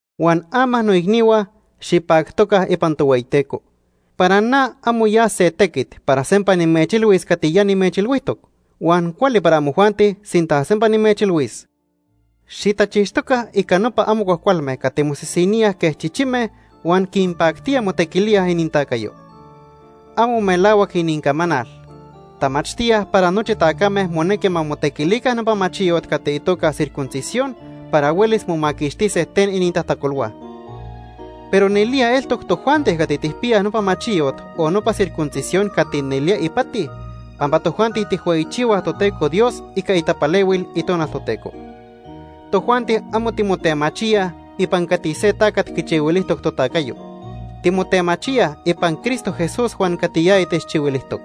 Huan ama, noicnihua, xipactoca ipan Tohueyiteco. Para na amo ya se tequit para sempa nimechilhuis cati ya nimechilhuijtoc. Huan cuali para amojuanti sinta sempa nimechilhuis. Xitachixtoca ica nopa amo cuajcualme cati mosisiníaj quej chichime huan quinpactía motequilíaj inintacayo. Amo melahuac inincamanal. Tamachtíaj para nochi tacame monequi ma motequilica nopa machiyot cati itoca circuncisión para huelis momaquixtise ten inintajtacolhua. Pero nelía eltoc tojuanti cati tijpiyaj nopa machiyot o nopa circuncisión cati nelía ipati, pampa tojuanti tijhueyichihuaj Toteco Dios ica itapalehuil Itonal Toteco. Tojuanti amo timotemachíaj ipan cati se tacat quichihuilijtoc totacayo. Timotemachíaj ipan Cristo Jesús huan cati yaya techchihuilijtoc.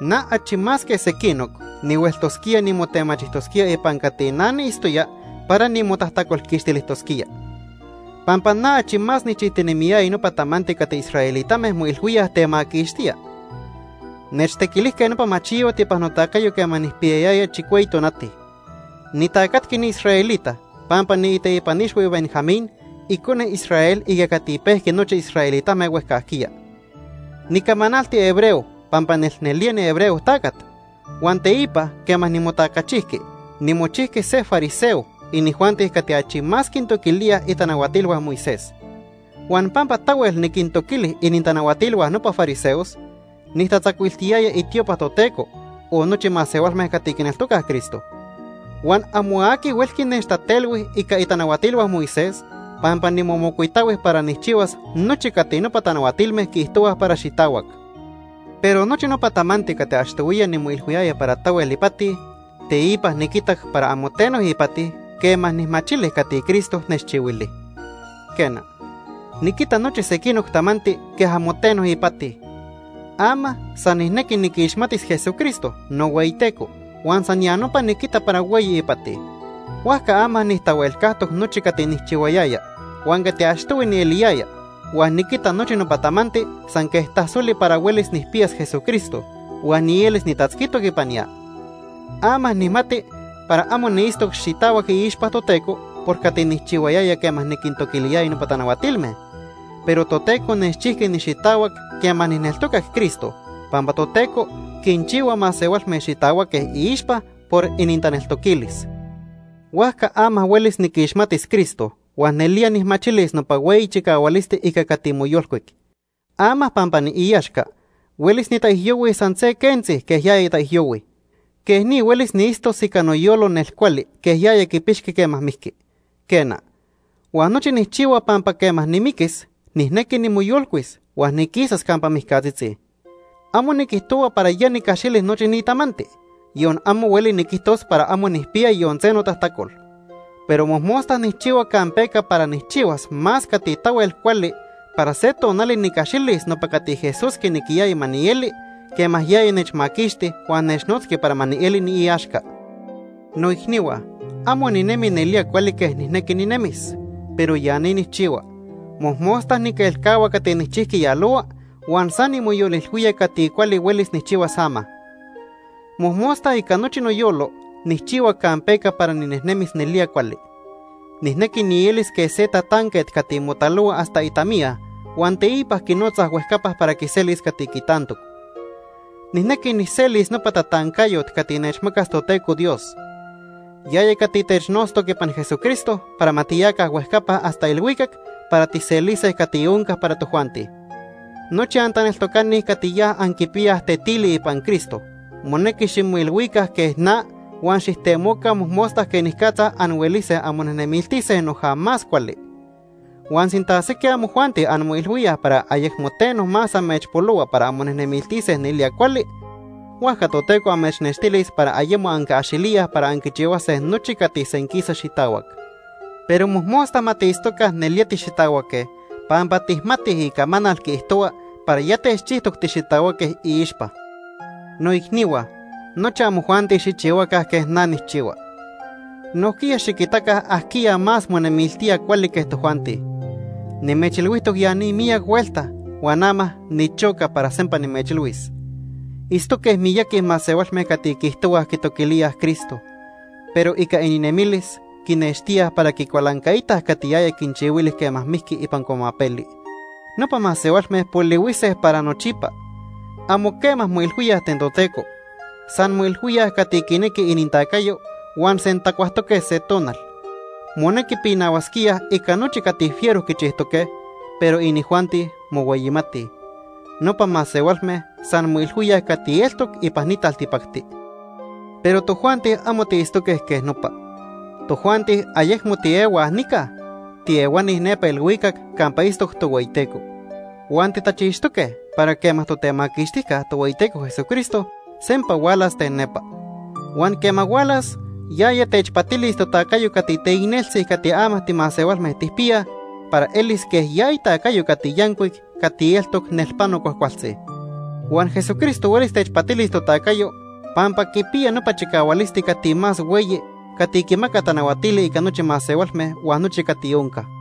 Na achi más que sequinoc nihueltosquía nimotemachijtosquía ipan cati na niitztoya para nimotajtacolquixtilijtosquía. Pampa na achi más nijchijtinemiyaya nopa tamanti cati israelitame moilhuíaj temaquixtía. Nechtequilijque nopa machiyot ipan notacayo quema nijpiyayaya chicueyi tonati. Nitacatqui niisraelita pampa niiteipan ixhui Benjamín, icone Israel ica cati pejqui nochi israelitame huejcajquiya. Nicamanalti hebreo pampa nelnelía nihebreo tacat. Huan teipa quema nimotacachijqui, nimochijqui se nifariseo, inijuanti cati achi más quintoquilíaj itanahuatilhua Moisés. Huan pampa tahuel niquintoquili inintanahuatilhua nopa fariseos, nijtatzacuiltiyaya itiopa Toteco, o nochi masehualme cati quineltocaj Cristo. Huan amo aqui huelqui nechtatelhui ica itanahuatilhua Moisés, pampa nimomocuitahui para nijchihuas nochi cati nopa tanahuatilme quiijtohuaj para xitahuac. Pero nochi nopa tamanti cati achtohuiya nimoilhuiyaya para tahuel ipati, teipa niquitac para amo teno ipati quema nijmachili cati Cristo nechchihuili. Quena, niquita nochi sequinoc tamanti quej amo teno ipati. Ama san nijnequi niquixmatis Jesucristo, nohueyiTeco, huan san ya nopa niquita para hueyi ipati. Huajca ama nijtahuelcajtoc nochi cati nijchihuayaya huan cati achtohui nieliyaya, huan niquita nochi nopa tamanti san quej tasoli para huelis nijpiyas Jesucristo, huan nielis nitatzquitoc ipan ya. Ama nijmati para amo niitztoc xitahuac iixpa Toteco por cati nijchihuayaya quema niquintoquiliyaya nopa tanahuatilme. Pero Toteco nechchijqui nixitahuac quema nijneltocac Cristo, pampa Toteco quinchihua masehualme xitahuaque iixpa por inintaneltoquilis. Huajca ama huelis niquixmatis Cristo huan nelía nijmachilis nopa hueyi chicahualisti ica cati moyolcuic. Ama pampa niiaxca, huelis nitaijyohuis san se quentzi quej yaya taijyohui. Quej ni huelis niitztos ica noyolo nel cuali quej yaya quipixqui quema mijqui. Quena, huan nochi nijchihua pampa quema nimiquis, nijnequi nimoyolcuis huan niquisas campa mijcatzitzi. Amo niquijtohua para ya nicaxili nochi ni tamanti, yon amo hueli niquijtos para amo nijpiya yon se notajtacol. Pero mojmosta nijchihua campeca para nijchihuas más cati tahuel cuali para se tonali nicaxilis nopa cati Jesús quinequiyaya ma nieli quema yaya nechmaquixti huan nechnotzqui para ma nieli niiaxca. Noicnihua, amo ninemi nelía cuali quej nijnequi ninemis. Pero ya ni nijchihua: Mojmosta niquelcahua cati nijchijqui yalohua huan san nimoyolilhuía cati cuali huelis nijchihuas ama. Mojmosta ica nochi noyolo nijchihua campeca para ninejnemis nelía cuali. Nijnequi nielis quej se tatanquet cati motalohua hasta itamiya huan teipa quinotzaj huejcapa para quiselis cati quitantoc. Nijnequi nijselis nopa tatancayot cati nechmacas Toteco Dios. Yaya cati technotztoc ipan Jesucristo para ma tiyaca huejcapa hasta ilhuicac para tijselise cati onca para tojuanti. Nochi antaneltocani cati ya anquipiyaj tetili ipan Cristo monequi ximoilhuica quej na huan xijtemoca mojmosta quenicatza anhuelise anmonemiltise noja más cuali. Huan sinta sequij amojuanti anmoilhuíaj para ayecmo teno más amechpolohua para anmonejnemiltise nelía cuali, huajca Toteco amechnextilis para ayemo anquiaxilíaj para anquichihuase nochi cati senquisa xitahuac. Pero mojmosta ma tiitztoca nelía tixitahuaque pampa tijmatij icamanal quiijtohua para ya techchijtoc tixitahuaque iixpa. Noicnihua, nochi amojuanti xijchihuaca quej na nijchihua. Nojquiya xiquitaca ajquiya más monemiltía cuali quej tojuanti. Nimechilhuijtoc ya ni miyac huelta huan ama nichoca para sempa nimechilhuis. Itztoque miyaqui masehualme cati quiijtohuaj quitoquilíaj Cristo, pero ica ininemilis quinextíaj para quicualancaitaj cati yaya quinchihuili quema mijqui ipan cuamapeli. Nopa masehualme polihuise para nochipa. Amo quema moilhuíaj ten Toteco. San moilhuíaj cati quinequi inintacayo huan sentacuajtoque se tonal. Monequi pinahuasquíaj ica nochi cati fiero quichijtoque, pero inijuanti mohueyimatij. Nopa masehualme san moilhuíaj cati eltoc ipan ni taltipacti. Pero tojuanti amo tiitztoque quej nopa. Tojuanti ayecmo tiehuaj nica, tiehuani nepa ilhuicac campa itztoc Tohueyiteco. Huan titachixtoque para quema Totemaquixtijca Tohueyiteco Jesucristo sempa hualas ten nepa. Huan quema hualas, yaya techpatilis totacayo cati teicneltzi cati ama timasehualme tijpiyaj para elis quej ya itacayo cati yancuic cati eltoc nelpano cuajcualtzi. Huan Jesucristo huelis techpatilis totacayo pampa quipiya nopa chicahualisti cati más hueyi cati quimaca tanahuatili ica nochi masehualme huan nochi cati onca.